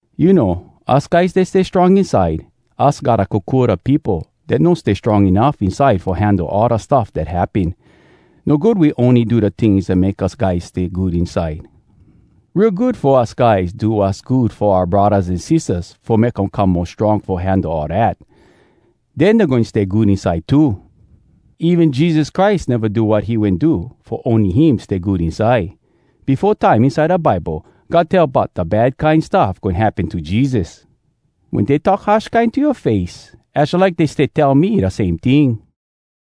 You know, us guys dat stay strong inside, us gotta kokua da peopo dat no stay strong enuff inside fo handle all da stuff dat happen. No good we ony do da tings dat make us guys stay good inside. Real good fo us guys do wass good fo oua braddahs an sistahs fo make um come mo strong fo handle all dat. Den dey goin stay good inside too. Even Jesus Christ neva do wat he wen do fo ony him stay good inside. Befo time inside da Bible, God tell bout da bad kine stuff goin happen to Jesus: “Wen dey talk harsh kine to yoa face, Az jalike dey stay tell me da same ting.”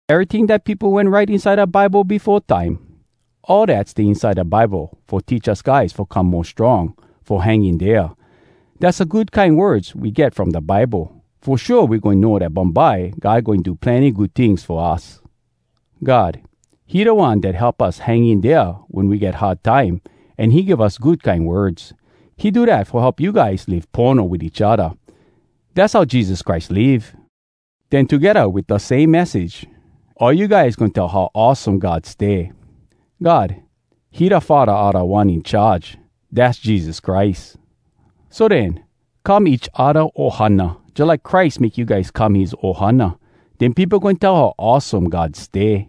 Eryting dat peopo wen write inside da Bible befo time, all dat stay inside da Bible fo teach us guys fo come mo strong fo hang in dea. Dass da good kine words we get from da Bible. Fo shua we goin know dat bumbye God goin do plenny good tings fo us. God, he da One dat help us hang in dea wen we get hard time an he give us good kine words. He do dat fo help you guys live pono wit each odda. Dass how Jesus Christ live. Den togedda wit da same message, all you guys goin tell how awesome God stay. God, he da Faddah a Da One In Charge, dass Jesus Christ. So den, come each odda ohana, jalike Christ make you guys come his ohana. Den peopo goin tell how awesome God stay.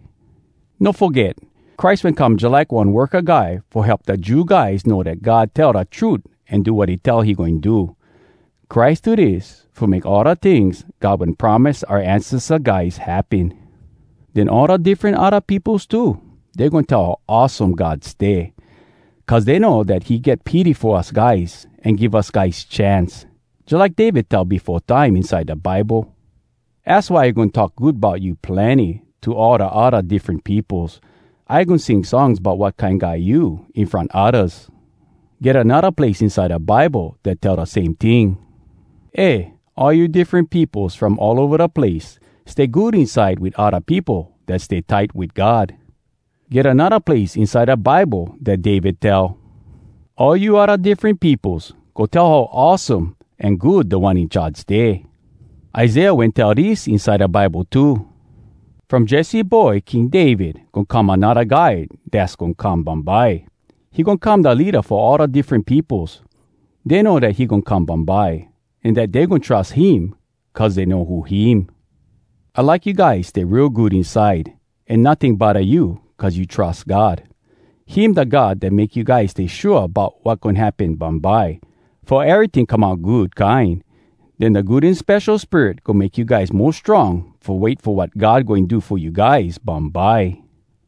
No foget, Christ wen come jalike one worka guy fo help da Jew guys know dat God tell da trut an do wat he tell he goin do. Christ do dis fo make all da tings God wen promise oua ancesta guys happen. Den all da diffren odda peopos too, dey goin tell how awesome God stay, cuz dey know dat he get pity fo us guys an give us guys chance. Jalike David tell befo time inside da Bible: “Az why I goin talk good bout you plenny To all da odda diffren peopos. I goin sing songs bout wat kine guy you in front oddas.” Get anodda place inside da Bible dat tell da same ting: “Eh, all you diffren peopos from all ova da place, Stay good inside wit odda peopo dat stay tight wit God.” Get anodda place inside da Bible dat David tell: “All you odda diffren peopos, Go tell how awesome an good Da One In Charge stay.” Isaiah wen tell dis inside da Bible too: “From Jesse boy King David, Goin get anodda Guy dass goin come bumbye. He goin come da leada fo all da diffren peopos. Dey know dat he goin come bumbye, An dat dey goin trus him cuz dey know who him.” I like you guys stay real good inside an notting bodda you cuz you trus God. Him da God dat make you guys stay shua bout wat goin happen bumbye, fo eryting come out good kine. Den da Good An Spesho Spirit goin make you guys mo strong fo wait fo wat God goin do fo you guys bumbye.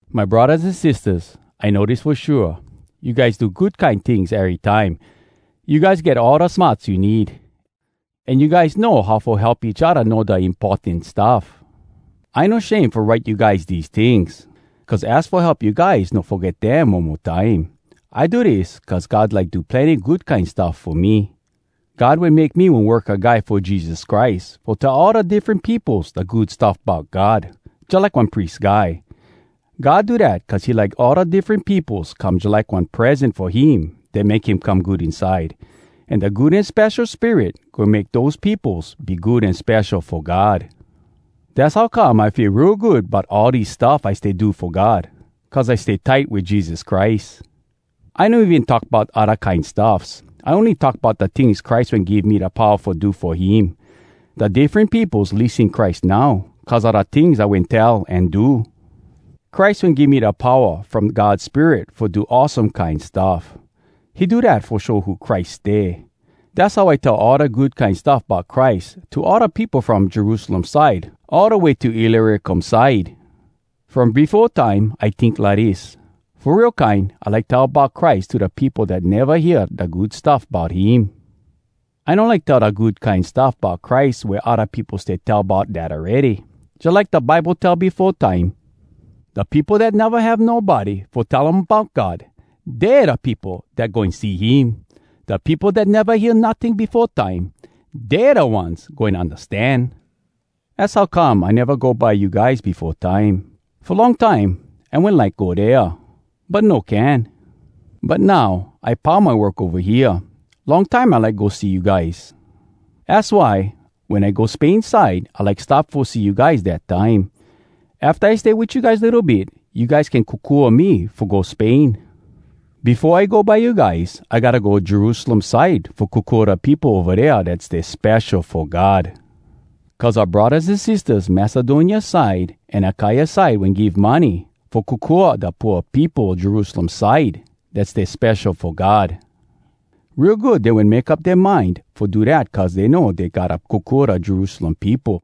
My braddahs an sistahs, I know dis fo shua: you guys do good kine tings erytime. You guys get all da smarts you need. An you guys know how fo help each odda know da importan stuff. I no shame fo write you guys dese tings, cuz az fo help you guys no foget dem one mo time. I do dis cuz God like do plenny good kine stuff fo me. God wen make me one worka guy fo Jesus Christ fo tell all da diffren peopos da Good Stuff Bout God, jalike one pries guy. God do dat cuz he like all da diffren peopos come jalike one present fo him dat make him come good inside. An da Good An Spesho Spirit goin make dose peopos be good an spesho fo God. Dass how come I feel real good bout all dis stuff I stay do fo God cuz I stay tight wit Jesus Christ. I no even talk bout odda kine stuffs. I ony talk bout da tings Christ wen give me da powa fo do fo him. Da diffren peopos lissen Christ now, cuz a da tings I wen tell an do. Christ wen give me da powa from God Spirit fo do awesome kine stuff. He do dat fo show who Christ stay. Dass how I tell all da Good Kine Stuff Bout Christ to all da peopo from Jerusalem side all da way to Illyricum side. From befo time, I tink lidis: “Fo real kine I like tell bout Christ to da peopo dat neva hear da Good Stuff Bout Him!” I no like tell da Good Kine Stuff Bout Christ wea odda peopo stay tell bout dat awready. Jalike da Bible tell befo time, “Da peopo dat neva have nobody fo tell um bout God, Dey da peopo dat goin see him. Da peopo dat neva hear notting befo time, Dey da ones goin undastan.” Az how come I neva go by you guys befo time. Fo long time, I wen like go dea, but no can. But now, I pau my work ova hea. Long time I like go see you guys. Az why, wen I go Spain side, I like stop fo see you guys dat time. Afta I stay wit you guys litto bit, you guys can kokua me fo go Spain. Befo I go by you guys, I gotta go Jerusalem side fo kokua da peopo ova dea dat stay spesho fo God. Cuz oua braddahs an sistahs Macedonia side an Akaia side wen give money fo kokua da pooa peopo Jerusalem side dat stay spesho fo God. Real good dey wen make up dea mind fo do dat cuz dey know dey gotta kokua da Jerusalem peopo.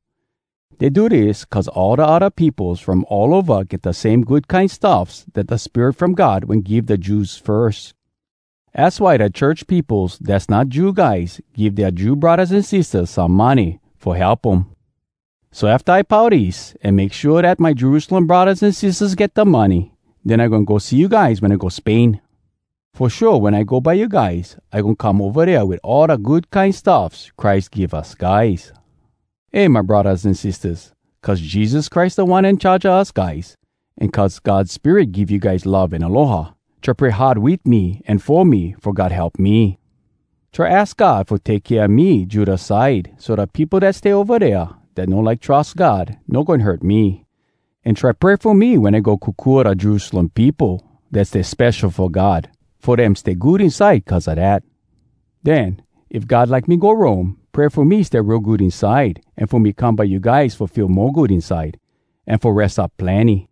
Dey do dis cuz all da odda peopos from all ova get da same good kine stuffs dat da Spirit from God wen give da Jews firs. Az why da church peopos dass not Jew guys give dea Jew braddahs an sistahs some money fo help um. So afta I pau dis, an make shua dat my Jerusalem braddahs an sistahs get da money, den I goin go see you guys wen I go Spain. Fo shua wen I go by you guys, I goin come ova dea wit all da good kine stuffs Christ give us guys. Eh, my braddahs an sistahs, cuz Jesus Christ Da One In Charge a us guys, an cuz God Spirit give you guys love an aloha, try pray hard wit me an fo me fo God help me. Try aks God fo take kea me Judea side, so da peopo dat stay ova dea dat no like trus God no goin hurt me. An try pray fo me wen I go kokua da Jerusalem peopo dat stay spesho fo God fo dem stay good inside cuz a dat. Den, if God like me go Rome, pray fo me stay real good inside, an fo me come by you guys fo feel mo good inside, an fo res up plenny.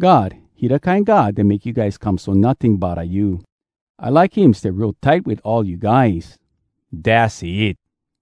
God, he da kine god dat make you guys come so notting bodda you. I like him stay real tight wit all you guys. Dass it!